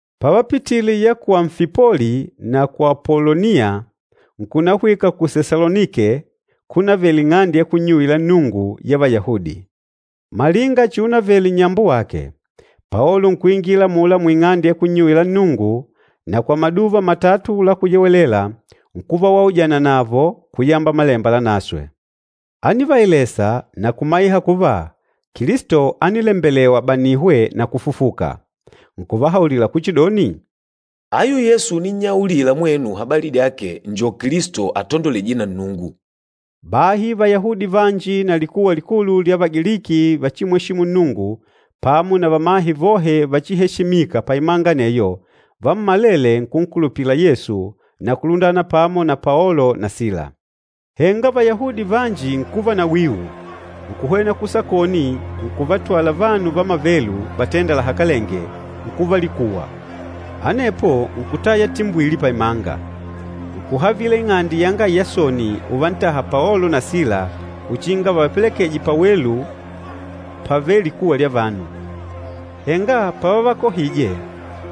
Pavapitile ya ku Amfipoli na ku Apoloniya, nkunahwika ku Sesalonike kunavele ing'ande ya kunnyuwila Nnungu ya Vayahudi. Malinga chiunavele nnyambo wake, Paolo nkuingila amula muing'ande ya kunnyuwila Nnungu na kwa Maduva matatu la Kuyewelela nkuva waujana navo kuyamba Malemba Lanaswe. Ánivaelesa na kumaiha kuva Kilisto ánilembelewa abanihwe na kufufuka. Nkuvahaulila kuchidoni, “Ayu Yesu uninnyaulila mwenu habali dyake njo Kilisto atandolwejîje na Nnungu.” Bahi Vayahudi vanji na likuwa likulu lya Vagiliki vachimweshîmu Nnungu pamo na vamahe vohe vachiheshimîka paimanga aneyo, vammalele nkunkulupila Yesu na kulundana pamo na Paolo na Sila. Henga Vayahudi vanji nkuva na wiu, nkuhwena kusakoni nkuvatwala vanu vamavelu vatênda lahakalenge, nkuva likuwa. Anepo nkutaya timbwili paimanga. Nkuhavila ing'ande yanga Yasoni uvantaha Paolo na Sila uchinga vavapelekeje pawelu pavêle likuwa lya vanu. Henga pavavakohije,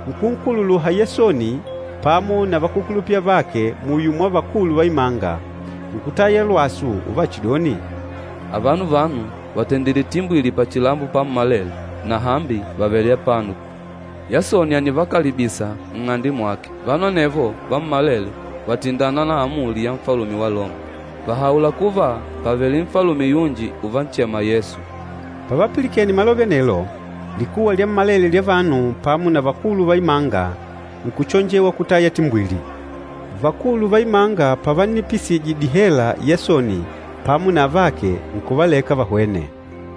nkunkukuluha Yasoni pamo na vakúkulupila avake muyo mwa vakulu va imanga, nkutaya lwasu uvachidoni, “Avano vanu vàtendile timbwili pachilambo pammalele na hambi vàvele apano. Yasoni ànivakalibisa nng'ande mwake. Vanu anevo vammalele vàtindana na amuli ya Nfalume wa Loma, vàhaula kuva pàvele nfalume yunji uvanchema Yesu.” Pavapilikene malove anelo, likuwa lyammalele lya vanu pamo na vakulu va imanga nkuchonjewa kutaya timbwili. Vakulu va imanga pavannipisije dihela Yasoni pamo na avake, nkuvaleka vahwene.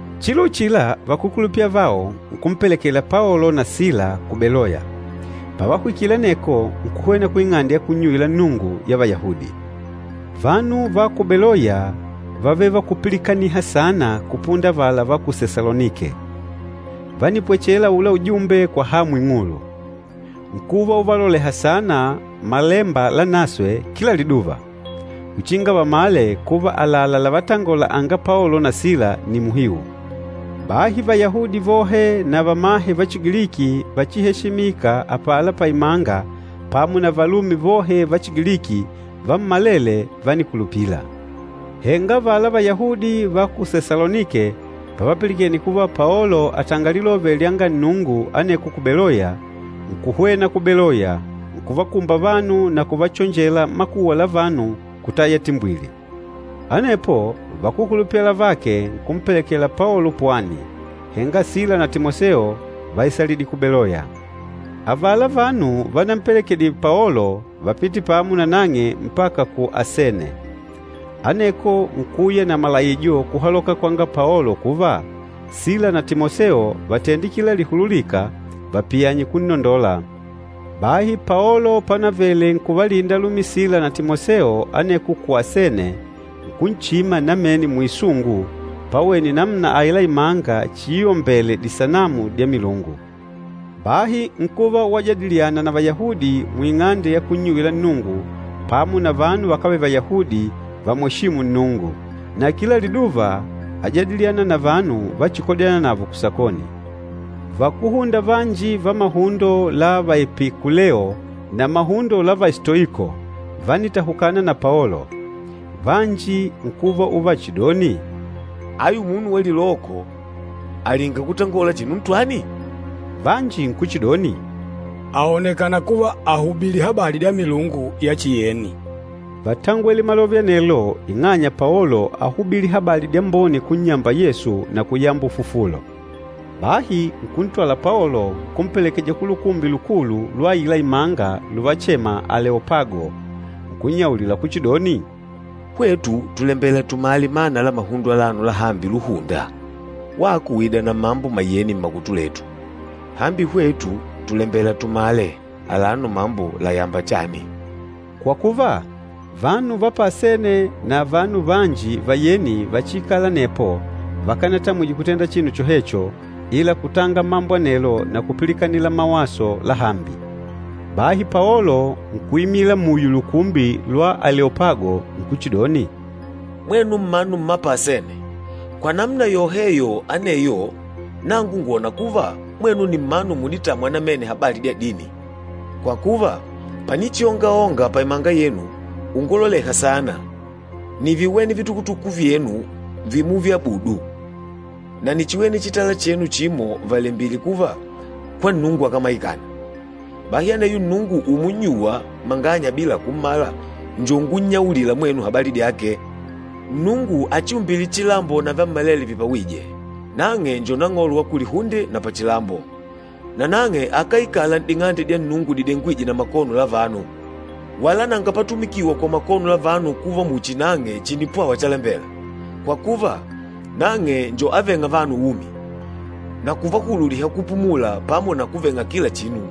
Chilo uchila, vakúkulupila avao nkumpelekela Paolo na Sila ku Beloya. Pavahwikile aneko, nkuhwena kuing'ande ya kunnyuwila Nnungu ya Vayahudi. Vanu va ku Beloya vávele vakúpilikaniha saana kupunda avala va ku Sesalonike. Vánipwechela aula ujumbe kwa hamu ing'ulu. Nkuva uvaloleha saana Malemba Lanaswe kila liduva, uchinga vamale kuva àlalá lavatangola anga Paolo na Sila nni muhiu. Bahi Vayahudi vohe na vamahe va Chigiliki vachiheshimîka apala paimanga pamo na valume vohe va Chigiliki, vammalele vánikulupila. Henga avala Vayahudi va ku Sesalonike pavapilikene kuva Paolo àtanga Lilove lyanga Nnungu aneko ku Beloya, nkuhwena ku Beloya, nkuvakumba vanu na kuvachonjela makuwa la vanu kutaya timbwili. Anepo vakúkulupila avake nkumpelekela Paolo pwani, henga Sila na Timoseo váisalidlile ku Beloya. Avala vanu vanampelekedile Paolo vápite pamo na nang'e mpaka ku Asene. Aneko nkuuya na malaijo kuhaloka kwanga Paolo kuva, Sila na Timoseo vatende kila lihululîka vapiyanye kunnondola. Bahi Paolo panavele nkuvalinda alumi Sila na Timoseo aneko ku Asene, nkunchima namene muisungu pawene namuna aila imanga chiiombele disanamu dya milungu. Bahi nkuva wajadiliana na Vayahudi muing'ande ya kunnyuwila Nnungu pamo na vanu vakávele Vayahudi vamweshîmu Nnungu. Na kila liduva ájadiliana na vanu vachikojâna navo kusakoni. Vakúhunda vanji va mahundo la Vaepikuleo na mahundo la Vastoiko vánitahukana na Paolo. Vanji nkuva uvachidoni, “Ayu munu wa liloko àlinga kutangola chinu ntwani?” Vanji nkuchidoni, “Àonekana kuva àhubili habali dya milungu ya chiyeni.” Vátangwele malove anelo ing'anya Paolo áhubili habali dyambone kunnyamba Yesu na kuyamba ufufulo. Bahi nkuntwala Paolo, nkumpelekeja ku lukumbi lukulu lwa aila imanga luvachema Aleopago, nkunnyaulila kuchidoni, “Hwetu tùlembela tumale mana la mahundo alano lahambi luhunda. Wako ùida na mambo mayeni mmakutu letu. Hambi hwetu tùlembela tumale alano mambo làyamba chani.” Kwa kuva, vanu va pa Asene na vanu vanji vayeni vachiikâla anepo vakanatamwije kutenda chinu chohecho, ila kutanga mambo anelo na kupilikanila mawaso lahambi. Bahi Paolo nkuimila muyo lukumbi lwa Aleopago, nkuchidoni, “Mwenu mmanu mma pa Asene! Kwa namuna yoheyo aneyo, nangu ngwòna kuva mwenu nni mmanu muditâmwa namene habali dya dini. Kwa kuva, panichiongaonga paimanga yenu, unguloleha saana, níviwene vitukutuku vyenu vimuviabudu, na níchiwene chitala chenu chimo valembìlè kuva, ‘KWA NNUNGU AKÁMAIKANA.’ Bahi aneyo Nnungu umunnyuwa manganya bila kummala njo ungunnyaulila mwenu habali dyake. Nnungu achiumbîle chilambo na vyammalele vipawîje, nang'e njo Nang'olo wa kulihunde na pachilambo, nanang'e akáikala n'ding'ande dya Nnungu didengwîje na makono la vanu. Wala nanga patumikiwa kwa makono la vanu kuva muchi nang'e chìnipwawa chalembela, kwa kuva, nang'e njo avêng'a vanu umi, na kuvahululiha kupumula pamo na kuveng'a kila chinu.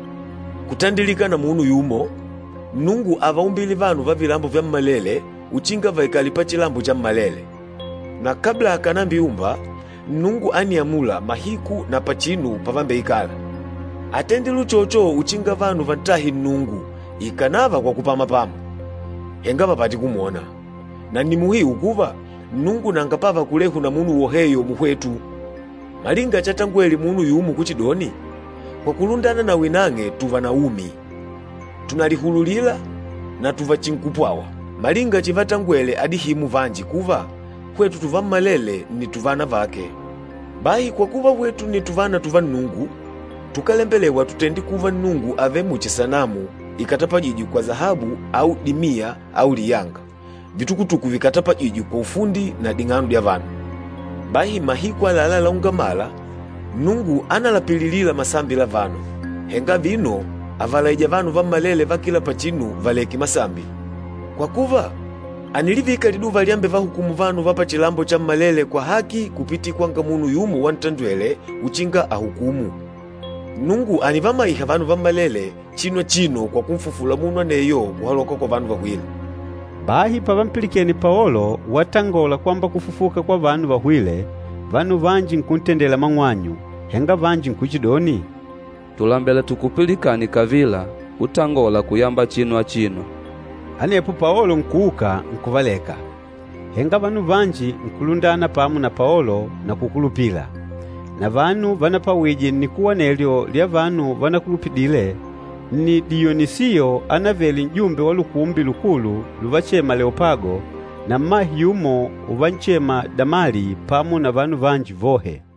Kutandilika na munu yumo, Nnungu ávaumbile vanu va vilambo vyammalele uchinga vaikale pachilambo chammalele. Na kabla akànambiumba, Nnungu ániamula mahiku na pachinu pavambeikala. Átendile uchocho uchinga vanu vantahe Nnungu ikànava kwa kupamapama, henga vapate kumwona. Na nni muhiu kuva, Nnungu nanga pava kulehu na munu woheyo muhwetu. Malinga chatangwele munu yumo kuchidoni, ‘Kwa kulundana nawi nang'e tuva na umi, tùnalihululila na tùvachinkupwawa!’ Malinga chivatangwele adihimu vanji kuva, ‘Hwetu tuvammalele nni tuvana vake.’ Bahi kwa kuva hwetu nni tuvana tuva Nnungu, tukálembelewa tutende kuva Nnungu àvele muchi sanamu ikatapajîjwe kwa sahabu au dimiya au liyanga, vitukutuku vikatapajîjwe kwa ufundi na ding'ano dya vanu. Bahi mahiku àlalá la ungamala, Nnungu ánalapililila masambi la vanu, henga vino àvalaija vanu vammalele va kila pachinu valekange masambi. Kwa kuva, ànilivika liduva lyambevahukumu vanu va pachilambo chammalele kwa haki kupitila kwanga munu yumo wantandwele uchinga ahukumu. Nnungu ànivamaiha vanu vammalele chinu achino kwa kunfufula munu aneyo kuhaloka kwa vanu vahwîle!” Bahi pavampilikene Paolo watangola kwamba kufufuka kwa vanu vahwîle, vanu vanji nkuntendele mang'wanyu, henga vanji nkuchidoni, “Tùlembela tukupilikane kavila utangòlà kuyamba chinu achino.” Anepo Paolo nkuuka, nkuvaleka. Henga vanu vanji nkulundana pamo na Paolo na kukulupila. Na vanu vanapwawije nnikuwa anelyo lya vanu vanakulupidile nni Diyonisiyo anavele n'jumbe wa Lukumbi Lukulu luvachema Aleopago, na mmahe yumo uvanchema Damali pamo na vanu vanji vohe.